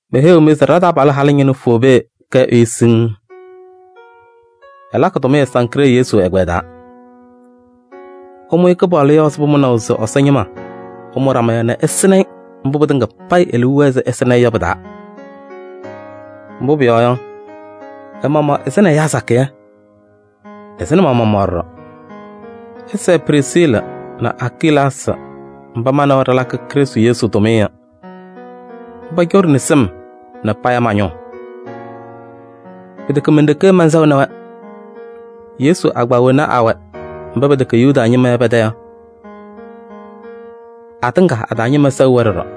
Meheyiɣ-mɩ se ɖa-taabalʋ halʋ ñɩnʋ Foobee kɛ ɛyʋ siŋŋ. Ɛlakɩ tʋmɩyɛ Sankree Yesu ɛgbɛyɛ taa. Ɩmʋ-ɩ Kɩpaɣlʋ yɔɔ ɛzɩ pʋmʋnaʋ se Ɛsɔ ñɩma ɛmʋ ɖama yɔ nɛ ɩsɩnɩ-ɩ mbʋ pɩtɩŋa payɩ e-liu wɛɛ se ɩsɩnɩ-ɩ yɔ pɩ-taa. Mbʋ pʋyɔɔ yɔ, ɛ-maɣmaɣ ɛsɩnɩ ɛyaa sakɩyɛ, ɛsɩnɩ ma-maɣmaɣ ɖɔɖɔ. Ɩsɛɛ Prisiili nɛ Akilaasɩ mba ma nɛ wɛ ɖɩlakɩ Krɩstʋ Yesu tʋmɩyɛ yɔ. Mba coɖini sɩm nɛ paya ma-ñʋʋ. Pɩtɛkɛ men-ɖeke mɛnsɛɣnɩ-wɛ, Yesu agbaa wena awɛ mba pɛtɛkɛ Yuda ñɩma yɔ pɛ-tɛ yɔ, atɩŋa a-taa ñɩma sɛɣ-wɛ ɖɔɖɔ.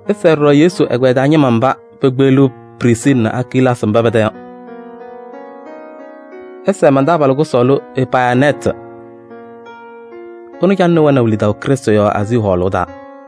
Ɩsɛɛ ɖɔɖɔ Yesu ɛgbɛyɛ taa ñɩma mba pekpeɣliɣ Prisiili nɛ Akilaasɩ mba pɛ-tɛ yɔ. Ɩsɛɛ man-taabalʋ kʋsɔɔlʋ Epayɩnɛɛtɩ. Ɛnʋ calɩnɩ wɛnaʋ lidaʋ Krɩstʋ yɔɔ Aazii hɔɔlʋʋ taa.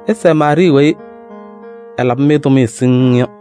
Ɩsɛɛ Maarɩɩ weyi ɛlabɩ-mɩ tʋmɩyɛ siŋŋ yɔ.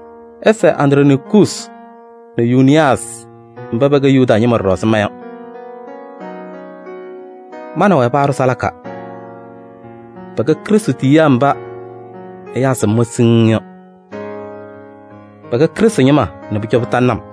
Ɩsɛɛ Andronikuusi nɛ Yuuniyaasɩ mba pɛkɛ Yuda ñɩma ɖɔɖɔ ɛzɩ ma yɔ. Ma nɛ wɛ paaɖʋ salaka. Pɛkɛ Krɩstʋ tiyiyaa mba ɛyaa sɩm-wɛ siŋŋ yɔ. Pɛkɛ Krɩstʋ ñɩma nɛ pʋcɔ pɩtalɩnɩ-m.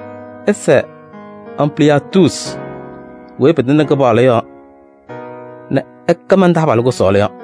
Ɩsɛɛ Ampliyaatuusi weyi pɩtɩŋnɩ Kɩpaɣlʋ yɔɔ nɛ ɛkɛ man-taabalʋ kʋsɔɔlʋ yɔ.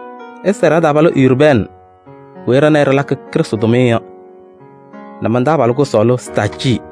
Ɩsɛɛ ɖa-taabalʋ Urbɛɛnɩ weyi ɖa nɛ ɩ ɖɩlakɩ Krɩstʋ tʋmɩyɛ yɔ nɛ man-taabalʋ kʋsɔɔlʋ Staacɩɩ.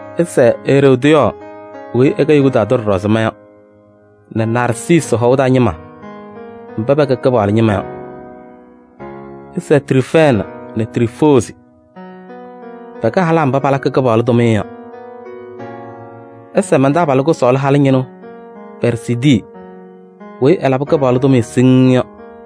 Ɩsɛɛ Eroodiyɔɔ weyi ɛkɛ Yuda tʋ ɖɔɖɔ ɛzɩ ma yɔ nɛ Narsiisi hɔʋ taa ñɩma mba pɛkɛ Kɩpaɣlʋ ñɩma yɔ. Ɩsɛɛ Triifɛɛnɩ nɛ Triifoozi. Pɛkɛ halaa mba palakɩ Kɩpaɣlʋ tʋmɩyɛ yɔ. Ɩsɛɛ man-taabalʋ kʋsɔɔlʋ halʋ ñɩnʋ Pɛɛrzidii weyi ɛlabɩ Kɩpaɣlʋ tʋmɩyɛ siŋŋ yɔ.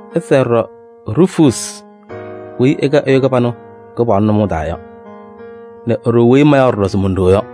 Ɩsɛɛ ɖɔɖɔ Ruufuusi weyi ɛkɛ ɛyʋ kɩbanʋ Kɩpaɣlʋ nʋmɔʋ taa yɔ nɛ e-ɖoo weyi mayaɣ ɖɔɖɔ se mon-ɖoo yɔ.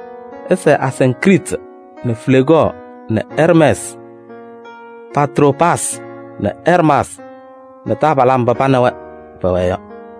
Ɩsɛɛ Asiŋkriiti nɛ Fleegɔɔ nɛ Ɛrmɛɛsɩ nɛ Patroobaasɩ nɛ Ɛrmaasɩ nɛ taabalaa mba pa nɛ wɛ pɛwɛɛ yɔ.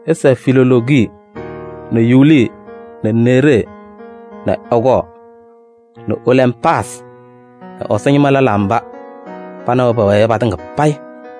Ɩsɛɛ Filoloogi nɛ Yuuli nɛ Neeree nɛ ɛ-kɔɔ nɛ Olɛmpaasɩ nɛ Ɛsɔ ñɩma lɛlaa mba pa nɛ wɛ pɛwɛɛ yɔ patɩŋa payɩ.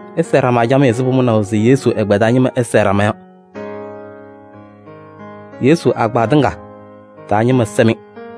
Ɩsɛɛ ɖama camɩyɛ ɛzɩ pʋmʋnaʋ se Yesu ɛgbɛyɛ taa ñɩma ɛsɛɛ ɖama yɔ. Yesu agbaa tɩŋa taa ñɩma sɛ-mɩ.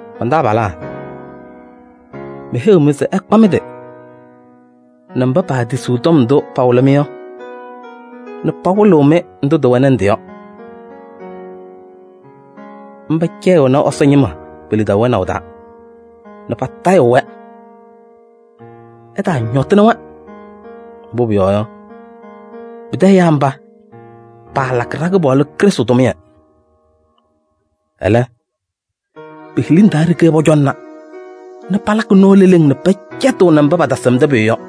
Man-taabalaa, meheyiɣ-mɩ se ɩkpa mɩ-tɩ nɛ mba paatisiɣ tɔm ndʋ pawɩlɩ-mɩ yɔ nɛ pawɩlɩɣ-mɩ ndʋ tɩwɛnɩ ndɩ yɔ. Mba cɛyɩɣnɩ Ɛsɔ ñɩma pe-lidaʋ wɛnaʋ taa nɛ patayɩɣ-wɛ. Ɩtaañɔtɩnɩ-wɛ. Mbʋ pʋyɔɔ yɔ, pɩtɛ ɛyaa mba, paalakɩ ɖa-Kɩpaɣlʋ Krɩstʋ tʋmɩyɛ. Ɛlɛ, pe-hiliŋ taa ɖeke pɔcɔŋna nɛ palakɩ nɔɔ leleŋ nɛ pɛcɛtɩɣnɩ mba patasɩmdɩ pʋyʋ yɔ.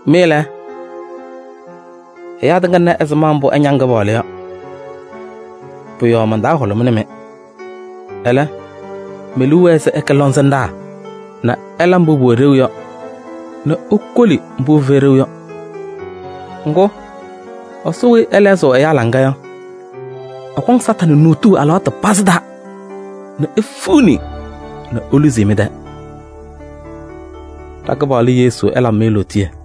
Mɩ lɛ, ɛyaa tɩŋa na ɛzɩma mbʋ ɩñaŋ Kɩpaɣlʋ yɔ. Pʋ-yɔɔ man-taa hʋlʋmɩnɩ-mɩ. Ɛlɛ, me-liu wɛɛ se ɩkɛ lɔŋsɩnɖaa nɛ ɩla mbʋ pʋwɛ ɖeu yɔ nɛ ikoli mbʋ pɩfɛyɩ ɖeu yɔ. Ŋgʋ, Ɛsɔ weyi ɛhɛzɩɣ ɛyaa laŋa yɔ, ɛkɔŋ Satanɩ nuutuu alɩwaatʋ pazɩ taa nɛ efiɣni nɛ eluzi-i mɩ-tɛɛ. Ɖa-Kɩpaɣlʋ Yesu ɛlabɩ-mɩ lootiye.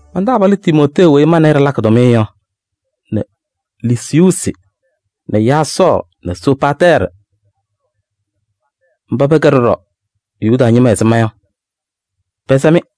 Man-taabalʋ Timootee weyi ma nɛ ɩ ɖɩlakɩ tʋmɩyɛ yɔ nɛ Lusiyuusi nɛ Yaasɔɔ nɛ Soziipatɛɛrɩ mba pɛkɛ ɖɔɖɔ Yuda ñɩma ɛzɩ ma yɔ, pɛsɛ-mɩ.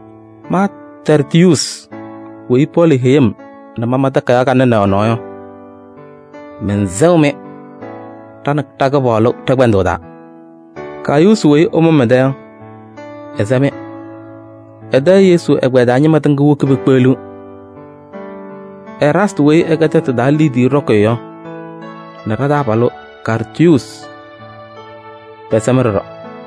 Ma Tɛrtiyuusi weyi Pɔɔlɩ heyi-m nɛ mama takayaɣ kanɛ nɛ ɛ-nɔɔ yɔ, mɛnsɛɣ-mɩ ɖa nɛ Kɩpaɣlʋ ɖɛ-kpɛndʋʋ taa. Gayuusi weyi ɛmʋ-m ɛ-tɛ yɔ, ɛsɛ-mɩ. Ɛ-tɛ Yesu ɛgbɛyɛ taa ñɩma tɩŋa woki pekpeɣliɣ. Eraastɩ weyi ɛkɛ tɛtʋ taa liidiye ɖɔkɩyʋ yɔ nɛ ɖa-taabalʋ Kaartuusi pɛsɛ-mɩ ɖɔɖɔ. [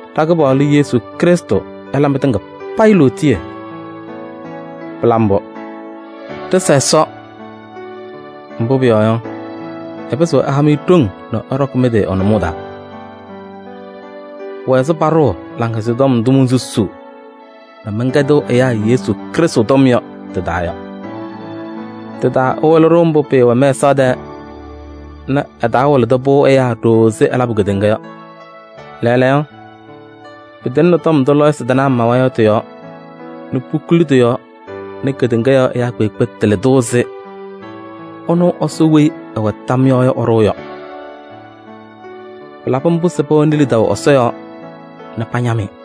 Ɖa-Kɩpaɣlʋ Yesu Krɩstʋ ɛla mɩtɩŋa payɩ lootiye. Pɩla mbʋ!] Ɖɩsa Ɛsɔ, mbʋ pʋyɔɔ yɔ, ɛpɩzɩɣ ɛha-mɩ ɖoŋ nɛ ɩɖɔkɩ mɩ-tɩ ɛ-nʋmɔʋ taa. Pʋwɛ ɛzɩ paɖʋʋ Laŋhɛzɩyɛ Tɔm ndʋ monsusuu nɛ mɛnkɛdɩɣ ɛyaa Yesu Krɩstʋ tɔm yɔ tɩ-taa yɔ. Tɩ-taa ɛwɩlɩ-ɖʋ mbʋ pɩɩwɛ mɛsaɣ tɛɛ nɛ ɛtaawɩlɩ-pʋ ɛyaa ɖooo ɛzɩ ɛlabʋ kedeŋa yɔ. Lɛɛlɛɛyɔ pɩtɩŋnɩ tɔm ndʋ lɔɔyɩsɩ tɩnaa mawa yɔ tɩ-yɔɔ nɛ pukuli tɩ-yɔɔ nɛ kedeŋa yɔɔ ɛyaa kpeekpe tɩlɩ-tʋ ɛzɩ ɛnʋ Ɛsɔ weyi ɛwɛ tam yɔɔ yɔ ɛɖʋʋ yɔ. Pɩlabɩ mbʋ se pɛwɛnɩ lidaʋ Ɛsɔ yɔɔ nɛ pañam-ɩ.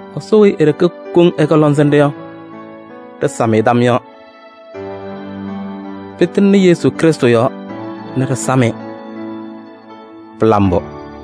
Ɛsɔ weyi e-ɖeke koŋ ɛkɛ lɔŋsɩnɖʋ yɔ, ɖɩsam-ɩ tam yɔɔ. Pɩtɩŋnɩ Yesu Krɩstʋ yɔɔ nɛ ɖɩsam-ɩ. Pɩla mbʋ!